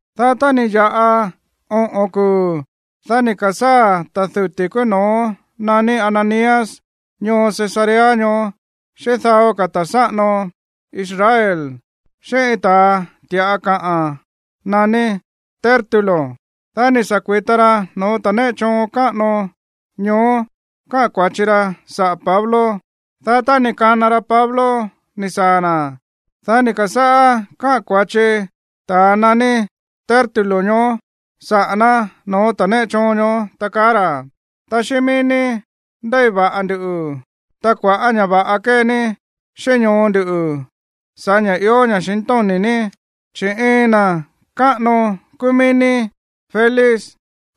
Dá tá ni̱ ya̱ꞌa oꞌo̱n kuu̱, dá ni̱ ka̱sáa̱ ta̱ duti̱ kúú no̱ó naní Ananías ñoo Cesarea ñoó xíꞌín dao ka̱ ta̱ sáꞌano Israel, xíꞌín iin ta̱a ti̱ꞌa kaꞌa̱n naní Tértulo. Dá ni̱ sa̱ kui̱ta ra no̱ó ta̱ néꞌe choon káꞌano ñoó kaꞌa̱n kua̱chi ra saꞌa̱ Pablo. Dá tá ni̱ kana ra Pablo ni̱ saa̱ na̱, dá ni̱ ka̱sáꞌá káꞌa̱n kua̱chi ta̱ naní Tértulo ñoó saꞌa̱ ná no̱ó ta̱ néꞌe choon ñoó, ta kaá ra̱: ―Ta xíꞌín mií ní ndéi va̱ꞌa nduꞌu̱, ta kua̱ꞌá ña̱ va̱ꞌa kée ní xíꞌín ñoo ndu̱ sa̱ꞌá ña̱ ió ña̱xintóni̱ ní. Chi̱ iin na̱ káꞌano kúú mií ní, Félix,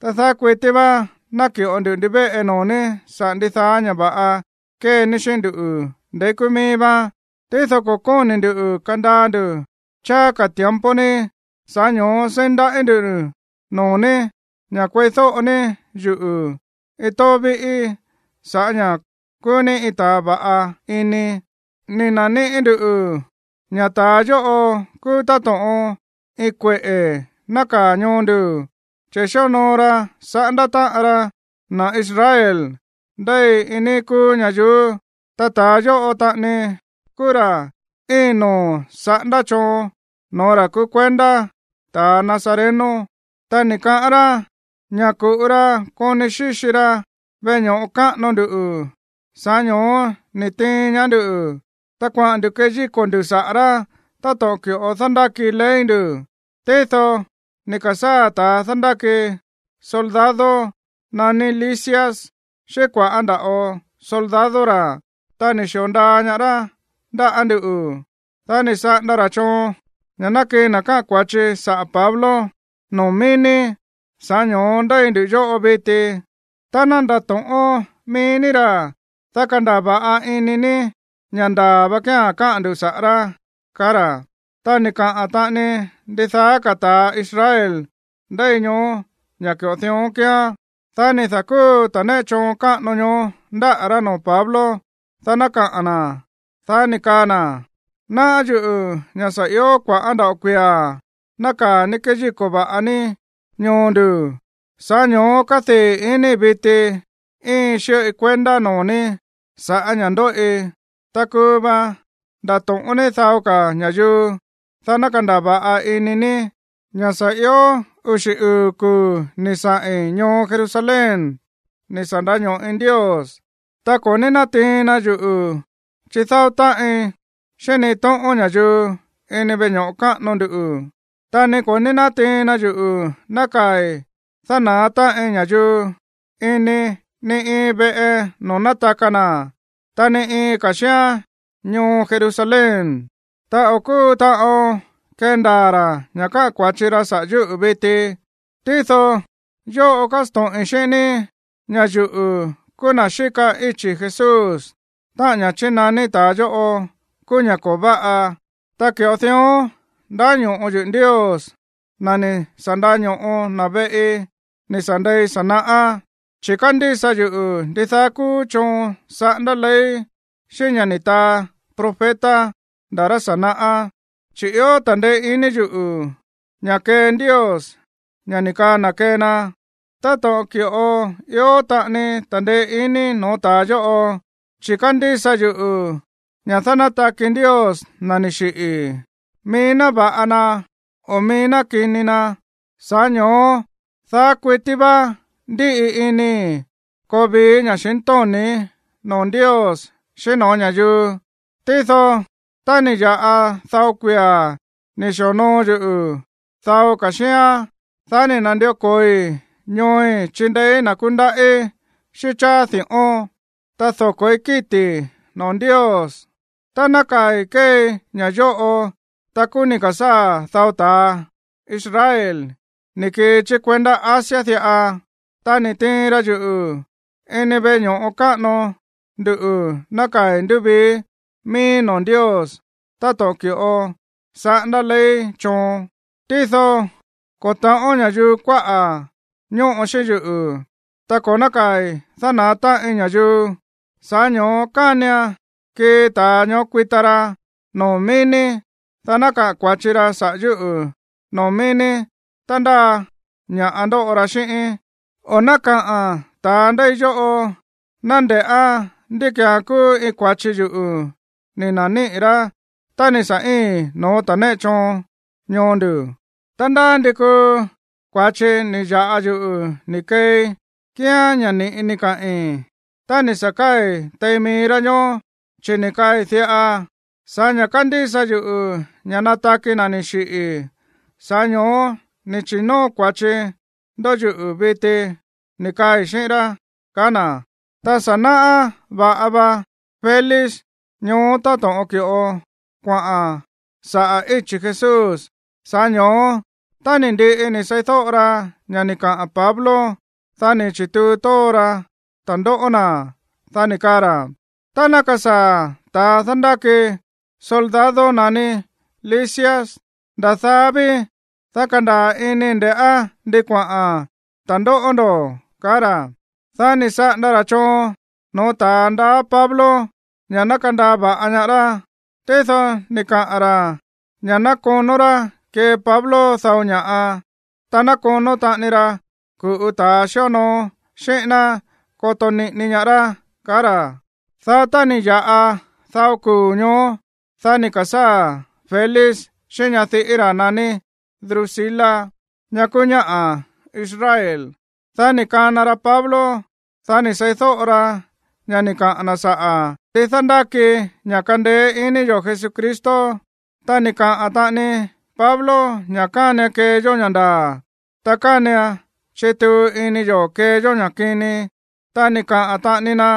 ta daá kuití vá náki̱ꞌo nduꞌu̱ ndivéꞌe noo̱ ní saꞌa̱ ndidaá ña̱ va̱ꞌa kée ní xíꞌín ndú ndeí kúú míí vá. Tído ko̱ kóni̱ ndu̱ kandaa ndu̱ cháá ka̱ tiempo ní, sa̱ꞌá ño̱ó seí ndaꞌí ndu̱ noo̱ ní ña̱ kueídóꞌo ní yuꞌu̱ iin tóó víꞌí sa̱ꞌá ña̱ kúú ní iin ta̱a va̱ꞌa ini. Ni̱ na̱níꞌi̱ ndú ña̱ ta̱a yóꞌo kúú táto̱ꞌon iin kueꞌe̱ nákaa̱ ñoo nduꞌu̱, chi̱ xíonoo ra saꞌándá táꞌan ra na̱ Israel ndéi iin níí kúú ñayuú. Ta ta̱a yóꞌo taꞌani kúú ra̱ íin noo̱ saꞌándá choon no̱ó ra̱ kúú kuendá ta̱ nazareno. Ta ni̱ kaꞌán rá ña̱ ku̱ꞌu ra koni xíxi ra veꞌe ño̱ꞌo káꞌano ndu. Sa̱ꞌá ño̱ó ni̱ tiin ñaá nduꞌu̱, ta kuaꞌa̱n ndu̱ keyíko̱ ndu̱ saꞌa̱ rá táto̱ꞌon ki̱ꞌo dándáki ley ndu̱. Tído ni̱ ka̱sáa̱ ta̱a dándáki soldado naní Lisias xíꞌín kua̱ꞌá nda̱ꞌo soldado ra̱, ta ni̱ xi̱o ndaa ñaá rá ndáꞌa̱ nduꞌu̱. Dá ni̱ saꞌanda ra̱ choon ña̱ ná kii na̱ káꞌa̱n kua̱chi saꞌa̱ Pablo noo̱ mií ní. Sa̱ꞌá ño̱ó ndéi ndu yóꞌo viti. Tá ndato̱ꞌón mií ní ra̱, dá kandaa̱ va̱ꞌa ini ní ña̱ ndaa̱ va kía̱n káꞌa̱n ndu̱ saꞌa̱ rá ―kaá ra̱. Ta ni̱ kaꞌa̱n taꞌani ndidaá ka̱ ta̱ Israel ndéi ñoó ña̱ ki̱ꞌo dión kíán. Dá ni̱ da̱kúu ta̱ néꞌe choon káꞌano ñoó ndáꞌa̱ rá noo̱ Pablo, dá ná kaꞌa̱n na̱. Dá ni̱ kaa na̱: ―Náꞌá yuꞌu̱ ña̱ sa̱ ió kua̱ꞌá nda̱ꞌo kuia̱ nákaa̱ ní kéyíko̱ va̱ꞌa ní ñoo ndu̱. Sa̱ꞌá ño̱ó kádii̱ inii̱ viti íiin xíꞌoi kuendá noo̱ ní sa̱ꞌá ña̱ ndóꞌi. Ta kuu va ndato̱ꞌón ní dao ka̱ ña̱yuu, dá ná kandaa̱ va̱ꞌa ini ní ña̱ sa̱ io uxi̱ uu̱ kuu̱ ni̱ saꞌi̱n ñoo Jerusalén ni̱ sa̱ ndaño̱ꞌi Ndios. Ta ko̱ ní nátiin na yuꞌu̱ chídáó táꞌin xíꞌín ni iin tóꞌón ña̱yuu ini veꞌe ño̱ꞌo káꞌano ndu. Ta ni ko̱ ní nátiin na yuꞌu̱ nákaa̱i̱ dána̱á táꞌin ña̱yuu ini ni iin veꞌe noo̱ nátaka na̱, ta ni iin ka̱ xíán ñoo Jerusalén. Ta o̱ kúu taꞌon kendaa̱ ra̱ ña̱ káꞌa̱n kua̱chi ra saꞌa̱ yúꞌu̱ viti. ’Tído yóꞌo kásto̱ꞌin xíꞌín ní ña̱ yuꞌu̱ kúú na̱ xíka íchi̱ Jesús, táꞌa̱n ña̱ chínaní ta̱a yóꞌo kúú ña̱ ko̱ váꞌa. Ta ki̱ꞌo dión ndáño̱ꞌo yuꞌu̱ Ndios, na̱ ni̱ sa̱ ndaño̱ꞌo na̱ veꞌi ni̱ sa̱ ndei sa̱ naꞌá, chi̱ kándísa yuꞌu̱ ndidaá kúú choon saꞌándá ley xíꞌín ña̱ ni̱ taa profeta nda̱ rá sa̱ naꞌá. Chi̱ ió ta̱ndeé iní yuꞌu̱ ña̱ kee Ndios ña̱ ni̱ kaa na̱ kee na, táto̱ꞌon ki̱ꞌo ió taꞌani ta̱ndeé iní no̱ó ta̱a yóꞌo. Chi̱ kándísa yuꞌu̱ ña̱ dánátaki Ndios na̱ ni̱ xiꞌi̱, mií ná va̱ꞌa na o mií ná kini na. Sa̱ꞌá ño̱ó daá kuití vá ndíꞌi inii̱ koo vii ña̱xintóni̱í noo̱ Ndios xíꞌín no̱ó ña̱yuu. ’Tído tá ni̱ ya̱ꞌa dao kuia̱ ni̱ xi̱onoo yuꞌu̱ dao ka̱ xíán, dá ni̱ na̱ndió ko̱oi ñooi̱ chindeéí na̱ kúndaꞌí xíꞌín cháá di̱ꞌón, ta doko̱í kíti̱ noo̱ Ndios. Ta nákaa̱i̱ kéei ña̱ yóꞌo, ta kúú ni̱ ka̱sáa̱ dao ta̱ Israel ni̱ kii chí kuendá Asia diꞌa, ta ni̱ tiin ra yuꞌu̱ ini veꞌe ño̱ꞌo káꞌano ndu nákaa̱i̱ ndúvii miíí noo̱ Ndios táto̱ꞌon ki̱ꞌo saꞌándá ley choon. Tído ko̱ ta̱ꞌón ña̱yuu kuáꞌa̱ ñóꞌo xíꞌín yuꞌu̱, ta ko̱ nákaa̱i̱ dána̱á táꞌin ña̱yuu. Sa̱ꞌá ño̱ó kánian kii ta̱a ñoó kuita ra noo̱ mií ní, dá ná kaꞌa̱n kua̱chi ra saꞌa̱ yúꞌu̱ noo̱ mií ní tá ndáa ña̱ꞌa ndóꞌo ra xíꞌíín. O ná kaꞌa̱n ta̱a ndéi yóꞌo ná nde̱ꞌá ndí ki̱án kúú iin kua̱chi yuꞌu̱ ni̱ na̱níꞌi̱ rá tá ni̱ sa̱ íii̱n no̱ó ta̱ néꞌe choon ñoo ndu̱. Ta ndá ndi kuu kua̱chi ni̱ ya̱ꞌa yuꞌu̱ ni̱ keei kíán ña̱ ni̱ꞌi ni̱ kaꞌi̱n tá ni̱ sa̱ káa̱i̱ tein mií rá ñoó, chi̱ ni̱ kaꞌi̱n diꞌa: “Sa̱ꞌá ña̱ kándísa yuꞌu̱ ña̱ nataki na̱ ni̱ xiꞌi̱, sa̱ꞌá ño̱ó ni̱ chi̱nóo kua̱chi ndó yuꞌu̱ viti”, ni̱ kaai̱ xíꞌín rá ―kaá na̱. Ta sa̱ náꞌá va̱ꞌa va Félix ñoó táto̱ꞌon ki̱ꞌo kuaꞌa̱n saꞌa̱ íchi̱ Jesús. Sa̱ꞌá ño̱ó, tá ni̱ ndiꞌi ni̱ seídóꞌo ra ña̱ ni̱ kaꞌa̱n Pablo, dá ni̱ chi̱tuu tóó ra ta̱ndóꞌó na̱. Dá ni̱ kaa ra̱: ―Tá ná kasaa̱ ta̱a dándáki soldado naní Lisias, nda̱ daá ví, dá kandaa̱ inii̱ nde̱ꞌá ndi kuaꞌa̱n ta̱ndóꞌó ndo̱ ―kaá ra̱. Dá ni̱ saꞌanda ra̱ choon no̱ó ta̱a ndaá Pablo ña̱ ná kandaa va̱ꞌa ñaá rá. Tído ni̱ kaꞌa̱n ra̱ ña̱ ná konó rá kee Pablo dao ña̱ꞌa, ta ná konó taꞌani ra ku̱ꞌu ta̱ xíonoo xíꞌín ná koto niꞌini ñaá rá, kaá ra̱. Dá tá ni̱ ya̱ꞌa dao kuu̱ ñoó, dá ni̱ ka̱sáa̱ Félix xíꞌín ñadiꞌí ra̱ naní Drusila, ña̱ kúú ñáꞌa̱ Israel. Dá ni̱ kana ra Pablo. Dá ni̱ seídóꞌo ra ña̱ ni̱ kaꞌa̱n na̱ saꞌa̱ ndi dándáki ña̱ kándéé iní yo̱ Jesucristo. Ta ni̱ kaꞌa̱n taꞌani Pablo ña̱ kánian kee yó ña̱ ndaa̱, ta kánian chituu ini yo̱ kee yó ña̱ kini. Ta ni̱ kaꞌa̱n taꞌani na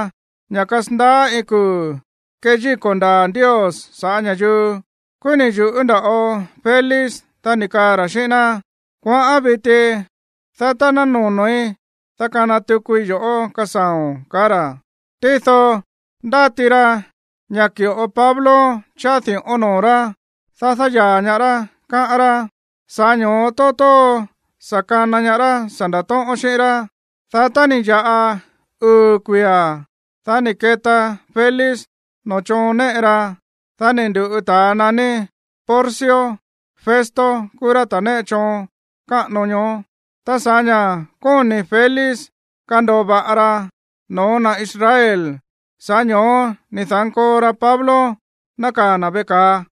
ña̱ kasandaá iin kuu̱ keyíko̱ ndaa̱ Ndios sa̱ꞌá ña̱yuu. Kúú ni̱ yu̱ꞌú nda̱ꞌo Félix. Dá ni̱ kaa ra̱ xíꞌín ná: ―Kuaꞌán viti, dá tá ná nono̱í, dá kana tukui yo̱ꞌó kasaa̱o̱n ―kaá ra̱. Tído ndáti ra ña̱ ki̱ꞌo Pablo cháá di̱ꞌón noo̱ rá, dá dáyaa̱ ñaá rá, káꞌán rá. Sa̱ꞌá ño̱ó tóó tóó sa̱ kana ñaá rá sa̱ nda̱tóꞌón xíꞌín rá. Dá tá ni̱ ya̱ꞌa uu̱ kuia̱, dá ni̱ keta Félix noo̱ choon néꞌe ra. Dá ni̱ ndu̱ꞌu ta̱a naní Porcio Festo kúú rá ta̱ néꞌe choon káꞌano ñoó. Ta sa̱ꞌá ña̱ kóni̱ Félix kando̱o va̱ꞌa ra no̱ó na̱ Israel, sa̱ꞌá ño̱ó ni̱ da̱nkoo ra Pablo nákaa̱ na̱ veꞌe ka̱a.